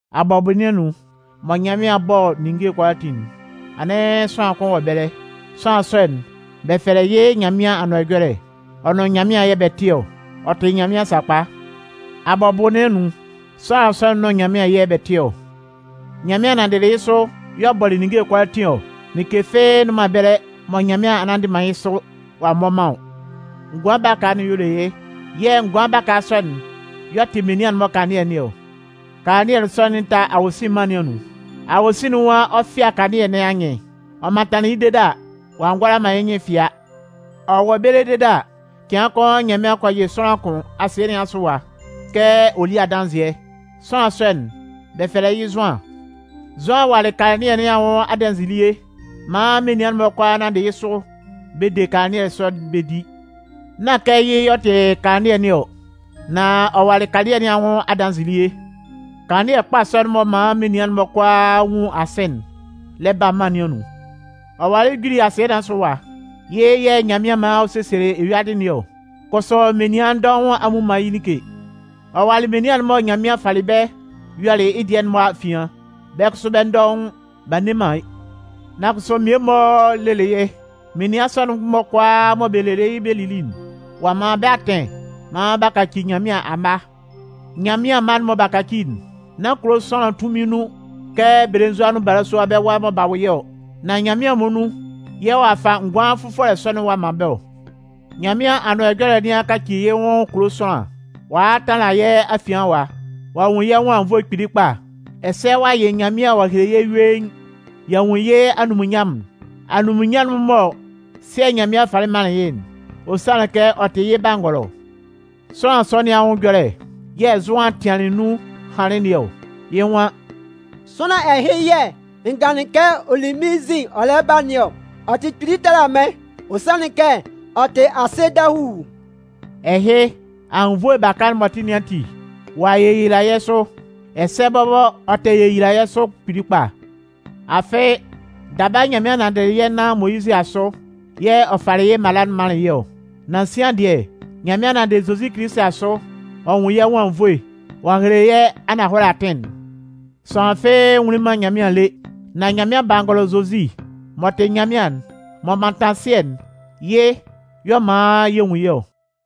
Abʋbɔ nɩn anun, mɔ Nyanmɩan 'bɔ ninnge kʋalaatin'n, anɩn sʋanlan kʋn wɔ ɛbɛlɛ. Sʋanlan sɔ'n, bɛ fɛlɛ yɩ́ Nyanmɩan Anʋan Ɛjɔlɛ. Ɔ nʋn Nyanmɩan yɛ̂ bɛ tɩ ɔ. Ɔ tɩ Nyanmɩan sakpa. Abʋbɔ nɩn anun, sʋanlan sɔ'n nʋn Nyanmɩan yɛ̂ bɛ tɩ ɔ. Nyanmɩan nanndɩlɩ yɩ́ sʋ y'ɔ bɔlɩ ninnge kʋalaatin ɔ. Like fɩ́ɩ́ nnʋn man ɛbɛlɛ mɔ Nyanmɩan a nnanndɩ man yɩ́ sʋ ɔ'a mmɔ man ɔ. Ngʋan baka'n y'ɔ le yɩ́. Yɛ̂ ngʋan baka sɔ'n y'ɔ tɩ menian'n-mɔ kanlannɩɛ nɩn ɔ. Kanlannɩɛ sɔ'n lɛ ta awosin mân nɩn anun. Awosin'n nwan ɔ 'fɩa kanlannɩɛ nɩn anyɩn. Ɔ mantanlɩn yɩ́ dede a, ɔ'a ngʋala man yɩ́ nyɩn fɩa. Ɔ wɔ ɛbɛlɛ dede a, cɩan kʋn Nyanmɩan kɔ yɩ sʋanlan kʋn asɩɛ nɩn asʋ ɛwa kɛ ɔ lí adanzɩɛ. Sʋanlan sɔ'n, bɛ fɛlɛ yɩ́ Zʋan. Zʋan walɩ kanlannɩɛ nɩn anwʋn adanzɩɛ elie maan menian'n-mɔ kʋalaa nanndɩ yɩ́ sʋ bɛ de kanlannɩɛ sɔ'n bɛ di. Nán kɛ yɩ́ y'ɔ tɩ kanlannɩɛ nɩn ɔ, nan ɔ walɩ kanlannɩɛ nɩn anwʋn adanzɩɛ elie. Kanlannɩɛ kpa sɔ'n m'ɔ man menian'n-mɔ kʋalaa nwun asɩ'n lɛ ba mân nɩn anun. Ɔ walɩ juli asɩɛ nɩn asʋ ɛwa. Yɩ́ yɛ̂ Nyanmɩan man ɔ sesielɩ eyuadɩ nɩn ɔ. Kʋsʋ menian dɔʋn a mmu man yɩ́ like. Ɔ walɩ menian'n mɔ Nyanmɩan falɩ bɛ́ yɔlɩ yɩ́ dɩɛ'n-mɔ afian, bɛ́ kʋsʋ bɛ́ dɔʋn, b'a nne man yɩ́. Nan kʋsʋ mmie-mɔ lelɩ yɩ́. Menian sɔ'n-mɔ kʋalaa mɔ bɛ leli yɩ́ bɛ lili'n, ɔ'a man bɛ́ atɩn maan b'a kaci Nyanmɩan amma. Nyanmɩan mma'n mɔ b'a kaci'n, nán kulo sʋanlan tunmin nun kɛ belenzua nʋn balasua bɛ́ wa mɔ b'a wʋ yɩ́ ɔ. Nan Nyanmɩan muonun yɛ̂ ɔ'a fa ngʋan fʋfɔlɛ sɔ'n ɔ'a man bɛ́ ɔ. Nyanmɩan Anʋan Ɛjɔlɛ nɩn a kaci yɩ́ nwʋn kulo sʋanlan, ɔ a a tanlan yɛ́ afian ɛwa. Ɔ'a nwun yɛ́ nwʋn anwunnvoe kpili kpa. Ɛsɛ ɔ'a yɩ Nyanmɩan ɔ'a hele yɛ́ yuein. Y'a nwun yɩ́ anunminnyanmʋn'n, anunminnyanmʋn'n mɔ Sɩɛ Nyanmɩan falɩ manlɩn yɩ́'n. Ɔ sanlɩn kɛ ɔ tɩ yɩ́ Bangɔlɔ. Sʋanlan sɔ nɩn anwʋn ɛjɔlɛ yɛ̂ Zʋan tɩanlɩn nun hanlɩn nɩn ɔ. Yɩ́ nwan: “Sʋanlan ɛhɩ yɛ̂ n ganlɩn kɛ ɔ li mɩ́n nzin ɔ lɛ ba nɩn ɔ. Ɔ tɩ kpili tala mɩ́n. Ɔ sanlɩn kɛ ɔ tɩ asɩ dahuu.” Ɛhɩ, anwunnvoe baka'n m'ɔ tɩ nɩn ati, ɔ'a yeyila yɛ́ sʋ. Ɛsɛ bɔbɔ, ɔ tɛ yeyila yɛ́ sʋ kpili kpa. Afɩ, daba Nyanmɩan nanndɩlɩ yɛ́ nan Moyizɩ asʋ yɛ̂ ɔ falɩ yɩ́ mala'n manlɩn yɛ́ ɔ. Nan sian dɩɛ, Nyanmɩan nanndɩ Zozi Kilisi asʋ ɔ'a nwun yɛ́ nwʋn anwunnvoe ɔ'a hele yɛ́ ananhɔlɛ atɩn'n. Sʋanlan fɩ́ɩ́ nwunlin man Nyanmɩan lé. Nan Nyanmɩan Bangɔlɔ Zozi m'ɔ tɩ Nyanmɩan'n, m'ɔ mantan Sɩɛ'n, yɩ́ y'ɔ man yɛ nwun yɩ́ ɔ.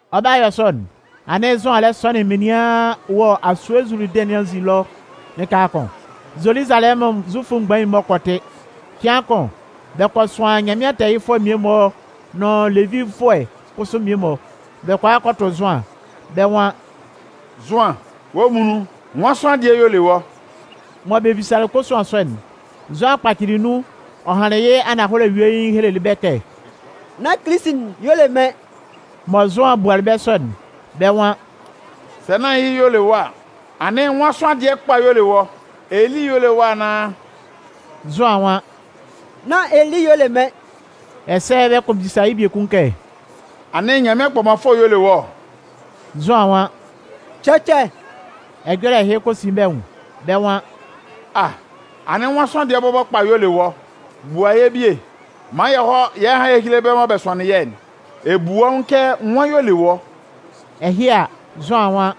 Ɔ 'ba yɔ sɔ'n, anɩn Zʋan lɛ sɔnɩn menian wɔ asue Zuludɩn nɩn anzin ɛlɔ lɩka kʋn. Zoluzalɛmʋn Zufʋ mgbain'n-mɔ kɔ tɩ. Cɩan kʋn, bɛ kɔ sʋan Nyanmɩan tɛɛyɩfʋɛ mmie-mɔ nʋn Levifʋɛ kʋsʋ mmie-mɔ, bɛ kɔ a kɔ tʋ Zʋan, bɛ́ nwan: “Zʋan, wɔ́ muonun, nwan sʋanlan dɩɛ y'ɔ le wɔ́?” Mɔ bɛ bisalɩ kosuan sɔ'n, Zʋan kpacɩlɩ nun ɔ hanlɩn yɩ́ ananhɔlɛ yuein helelɩ bɛ́ kɛ: “Nán Kilisi'n y'ɔ le mɩ́n.” Mɔ Zʋan bualɩ bɛ́ sɔ'n, bɛ́ nwan: “Sɛ nán yɩ́ y'ɔ le wɔ́ a, anɩn nwan sʋanlan dɩɛ kpa y'ɔ le wɔ́? Eli y'ɔ le wɔ́ anaan?” Zʋan nwan: “Nán Eli y'ɔ le mɩ́n.” Ɛsɛ bɛ kɔ bisa yɩ́ biekun kɛ: “Anɩn Nyanmɩan Kpɔmanfʋɛ'n y'ɔ le wɔ́ ɔ?” Zʋan nwan: “Cɛcɛ.” Ɛjɔlɛ ɛhɩ kɔ sin bɛ́ nwʋn, bɛ́ nwan: “A! Anɩn nwan sʋanlan dɩɛ bɔbɔ kpa y'ɔ le wɔ́? Bua yɛ́ bie maan yɛ hɔ́ hán héle bɛ́ mɔ bɛ sʋanlɩn yɛ́'n. Ɛ bu wɔ́ nwʋn kɛ nwan y'ɔ le wɔ́?” Ɛhɩ a, Zʋan nwan: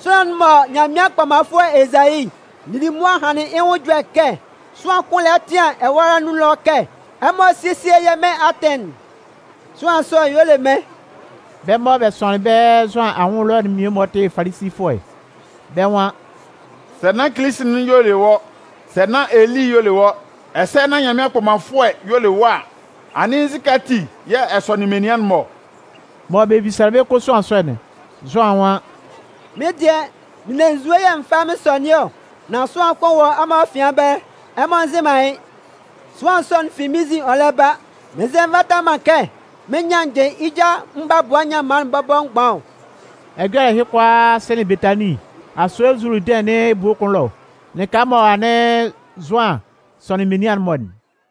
“Sʋanlan'n mɔ Nyanmɩan Kpɔmanfʋɛ Ezayi lili mʋa hanlɩn yɩ́ nwʋn ɛjɔlɛ kɛ: Sʋanlan kʋn lɛ tɩan ɛwâ nɩn anun ɛlɔ kɛ: ‘Ɛmɔ sésie yɛ́ Mɩn atɩn'n!’ sʋanlan sɔ'n y'ɔ le mɩ́n.” Bɛ́ mɔ bɛ sʋanlɩn bɛ́ Zʋan anwʋn ɛlɔ'n mmie-mɔ tɩ Falisifʋɛ. Bɛ́ nwan: “Sɛ nán Kilisi'n y'ɔ le wɔ́, sɛ nán Eli y'ɔ le wɔ́, ɛsɛ sɛ nán Nyanmɩan Kpɔmanfʋɛ'n y'ɔ le wɔ́ a, anɩn nzukɛ ati yɛ̂ ɛ sɔnɩn menian'n-mɔ ɔ?” Mɔ bɛ bisalɩ kosuan sɔ'n, Zʋan nwan: “Mɩ́n dɩɛ, n ne nzue yɛ̂ mɩn fa mɩn sɔnɩn ɔ, nan sʋanlan kʋn wɔ ɛmɔ afian ɛbɛlɛ, ɛmɔ nzɩ man yɩ́. Sʋanlan sɔ'n fi mɩ́n nzin ɔ lɛ ba, mɩn nzɛ nvata man kɛ mɩn nyannjɩ yɩ́ ja mgbabʋa nyanman'n bɔbɔ mgban ɔ.” Ɛjɔlɛ ɛhɩ kʋalaa sɩnlɩn Betanin, asue Zuludɩn nɩn ebue kʋn ɛlɔ, lɩka mɔ anɩn Zʋan sɔnɩn menian'n-mɔ'n.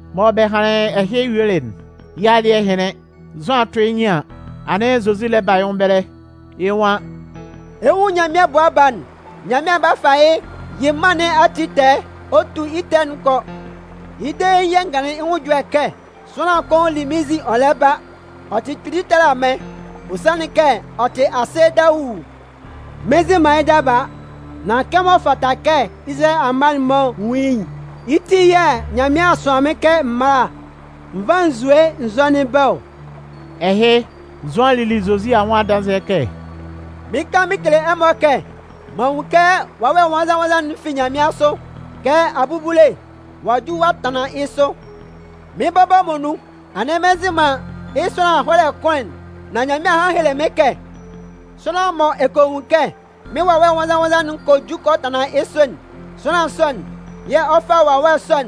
Mɔ bɛ hanlɩn ɛhɩ yuelɩ'n, yɩ́ alɩ́ɛ hɩnlɩn, Zʋan 'tʋ yɩ́ nyɩn an, anɩn Zozi lɛ ba yɩ́ nwʋn ɛbɛlɛ, yɩ́ nwan: “Ɛ 'nwun Nyanmɩan Bʋa Baa'n, Nyanmɩan 'ba fa yɩ́ yɩ mân nɩn ati tɛɛ ɔ tu yɩ́ ɛtɛ'n kɔ. Yɩ́ dein yɛ̂ n ganlɩn yɩ́ ɛjɔlɛ kɛ: ‘Sʋanlan kʋn li mɩ́n nzin ɔ lɛ ba, ɔ tɩ kpili tala mɩ́n. Ɔ sanlɩn kɛ ɔ tɩ asɩ dahuu.’ Mɩn nzɩ man yɩ́ daba. Nan kɛmɔ ɔ fata kɛ Izalayɛ amma'n-mɔ nwun yɩ́'n, yɩ́ ti yɛ̂ Nyanmɩan a sʋan mɩ́n kɛ m mála n vá nzue n zɔ́nɩn bɛ́ ɔ.” Ɛhɩ, Zʋan lili Zozi anwʋn adanzɩɛ kɛ: “Mɩɩn kan mɩn kele ɛmɔ kɛ, m'an nwun kɛ Wawɛ Nwannzan-nwannzan'n fi nyanmɩansʋ kɛ abubule ɔ'a ju ɔ'a tanlan yɩ́ sʋ. Mɩ́n bɔbɔ muonun, anɩn mɩn nzɩ man yɩ́ sʋanlan ɛhɔlɛ kʋn'n, nan Nyanmɩan a han a hele mɩ́n kɛ: ‘Sʋanlan'n mɔ ɛ kɔ nwun kɛ mɩ́n Wawɛ Nwannzan-nwannzan'n kɔ ju kɔ tanlan yɩ́ sʋ'n, sʋanlan sɔ'n yɛ̂ ɔ 'fa Wawɛ sɔ'n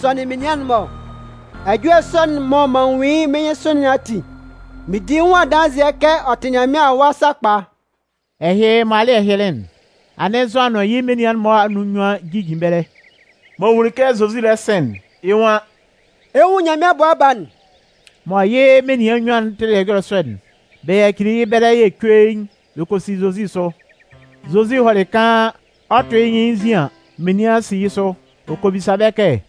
sɔnɩn menian'n-mɔ ɔ.’ Ɛjɔlɛ sɔ'n mɔ m'an nwun yɩ́ mɩ́n nyɩnsʋ nɩn ati, mɩn di yɩ́ nwʋn adanzɩɛ kɛ ɔ tɩ Nyanmɩan Awa sakpa.” Ɛhɩ mɔ alɩ́ɛ hɩnlɩn'n, anɩn Zʋan nʋn yɩ́ menian'n-mɔ anun nnyuan jijin ɛbɛlɛ. M'ɔ nwunlin kɛ Zozi lɛ sɩn'n, yɩ́ nwan: “Ɛ 'nwun Nyanmɩan Bʋa Baa'n.” Mɔ yɩ́ menian nnyuan'n tɩlɩ ɛjɔlɛ sɔ'n, bɛ yacili yɩ́ ɛbɛlɛ yɛ̂ cuein, bɛ kɔ si Zozi sʋ. Zozi hɔlɩ kaan, ɔ 'tʋ yɩ́ nyɩn yɩ́ nzin an, menian si yɩ́ sʋ. Ɔ kɔ bisa bɛ́ kɛ: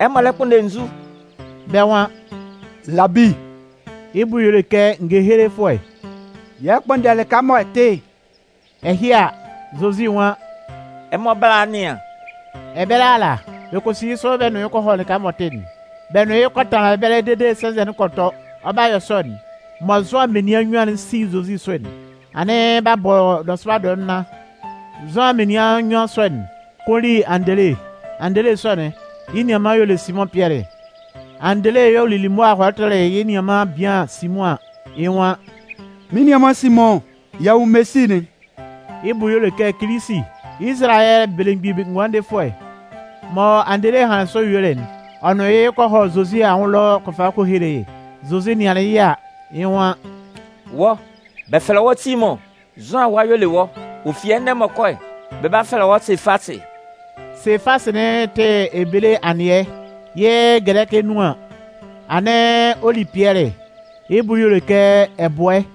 “Ɛmɔ lɛ kpʋnndɛ nzu?” Bɛ́ nwan: “Labi” (yɩ́ bʋ y'ɔ le kɛ ngehelefʋɛ), “yɛ lɛ kpʋnndɛ lɩka mɔ ɛ tɩ'n.” Ɛhɩ a, Zozi nwan: “Ɛmɔ bála a nɩan.” Ɛbɛlɛ ala, bɛ kɔ si yɩ́ sʋ bɛ nʋn yɩ́ kɔ hɔ lɩka m'ɔ tɩ'n, bɛ nʋn yɩ́ kɔ tanlan ɛbɛlɛ dede sɛnzɛ'n kɔ tɔ. Ɔ 'ba yɔ sɔ'n, mɔ Zʋan menian nnyuan'n 'si Zozi sʋ'n, anɩn b'a bɔ nɔsʋba dɔɛ nnan. Zʋan menian nnyuan sɔ'n, kʋn li Andele. Andele sɔ'n, yɩ́ nianman y'ɔ le Simʋn Pɩɛlɩ. Andele y'ɔ lili mʋa hɔlɩ tʋlɩ yɩ́ nianman bian Simʋn an, yɩ́ nwan: “Mɩ́n nianman Simʋn, y'a nwun Mesi'n.” (Yɩ́ bʋ y'ɔ le kɛ Kilisi, Izalayɛ Belemgbin Ngʋandefʋɛ.) Mɔ Andele hanlɩn sɔ yuelɩ'n, ɔ nʋn yɩ́ kɔ hɔ Zozi anwʋn ɛlɔ ɔ kɔ fa yɩ́ kɔ hele yɩ́. Zozi nɩanlɩn yɩ́ a, yɩ́ nwan: “Wɔ́, bɛ fɛlɛ wɔ́ Simʋn. Zʋan awa y'ɔ le wɔ́. Ɔ fi ɛnɛ m'ɔ kɔ'n, bɛ 'ba fɛlɛ wɔ́ Sefasɩ.” (Sefasɩ'n tɩ ebele anɩɛ, yɩ́ gɛlɛkɩ nun an, anɩn ɔ li Pɩɛlɩ. Yɩ́ bʋ y'ɔ le kɛ ɛbʋɛ.)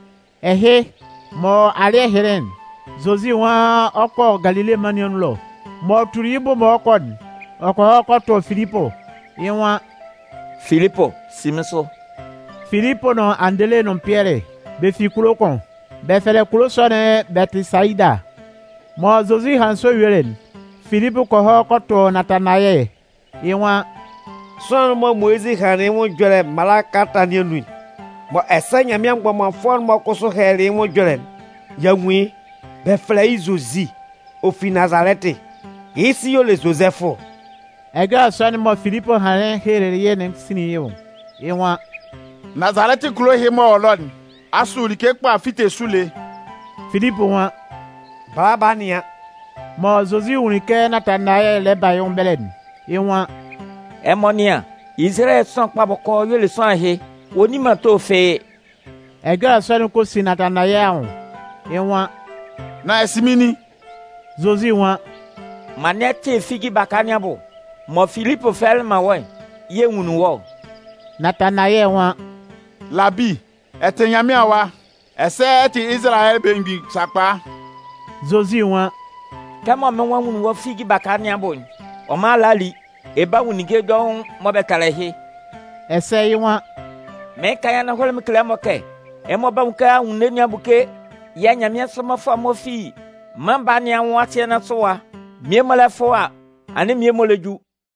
Ɛhɩ, mɔ alɩ́ɛ hɩnlɩn'n, Zozi nwan ɔ 'kɔ Galile mân nɩn anun ɛlɔ. M'ɔ tuli yɩ́ bʋ mɔ ɔ 'kɔ'n, ɔ kɔ hɔ kɔ tʋ Filipʋ, yɩ́ nwan: “Filipʋ, si mɩ́n sʋ!” Filipʋ nʋn Andele nʋn Pɩɛlɩ, bɛ fi kulo kʋn. Bɛ fɛlɛ kulo sɔ'n Bɛtɩsayida. Mɔ Zozi hanlɩn sɔ yuelɩ'n, Filipʋ kɔ hɔ kɔ tʋ Natanayɛ, yɩ́ nwan: “Sʋanlan'n mɔ Moyizɩ hanlɩn yɩ́ nwʋn ɛjɔlɛ Mala Kalata nɩn anun, mɔ ɛsɛ Nyanmɩan mgbɔmanfʋɛ'n-mɔ kʋsʋ hɛlɛlɩ yɩ́ nwʋn ɛjɔlɛ'n, y'a nwun yɩ́. Bɛ fɛlɛ yɩ́ Zozi. Ɔ fi Nazalɛtɩ. Yɩ́ sɩ y'ɔ le Zozɛfʋ.” Ɛjɔlɛ sɔ'n mɔ Filipʋ hanlɩn helelɩ yɩ́'n sinlin yɩ́ nwʋn, yɩ́ nwan: “Nazalɛtɩ kulo ɛhɩ m'ɔ wɔ ɛlɔ'n, asʋ like kpa 'fite sʋ lé?” Filipʋ nwan: “Bala, ba nɩan.” Mɔ Zozi nwunlin kɛ Natanayɛ lɛ ba yɩ́ nwʋn ɛbɛlɛ'n, yɩ́ nwan: “Ɛmɔ nɩ́an, Izalayɛ sʋanlan bɔkɔɔ y'ɔ le sʋanlan ɛhɩ, ɔ nni man ato fɩ́ɩ́.” Ɛjɔlɛ sɔ'n kɔ sin Natanayɛ anwʋn, yɩ́ nwan: “Nan ɛ sɩ mɩ́n nin?” Zozi nwan: “Mɔ anɩn ɛ tɩ figi baka nɩn abʋ, mɔ Filipʋ fɛlɛlɩ man wɔ́'n yɛ̂ n nwunlin wɔ́ ɔ.” Natanayɛ nwan: “Labi, ɛ tɩ Nyanmɩan Awa, ɛsɛ ɛ tɩ Izalayɛ Belemgbin sakpa.” Zozi nwan: “Kɛmɔ mɩ́n nwan n nwunlin wɔ́ figi baka nɩn abʋ'n, ɔ man a le a li? Ɛ 'ba nwun ninnge dɔʋn mɔ bɛ tala ɛhɩ.” Ɛsɛ yɩ́ nwan: “Mɩɩn kan yɩ́ ananhɔlɛ mɩn kele ɛmɔ kɛ, ɛmɔ 'ba nwun kɛ anwunno nɩn a buke yɛ̂ nyanmɩansʋ mmɔfʋɛ'n-mɔ fi Mân Baa nɩn anwʋn asɩɛ nɩn asʋ ɛwa, mmie-mɔ lɛ fʋ a, anɩn mmie-mɔ lɛ ju.”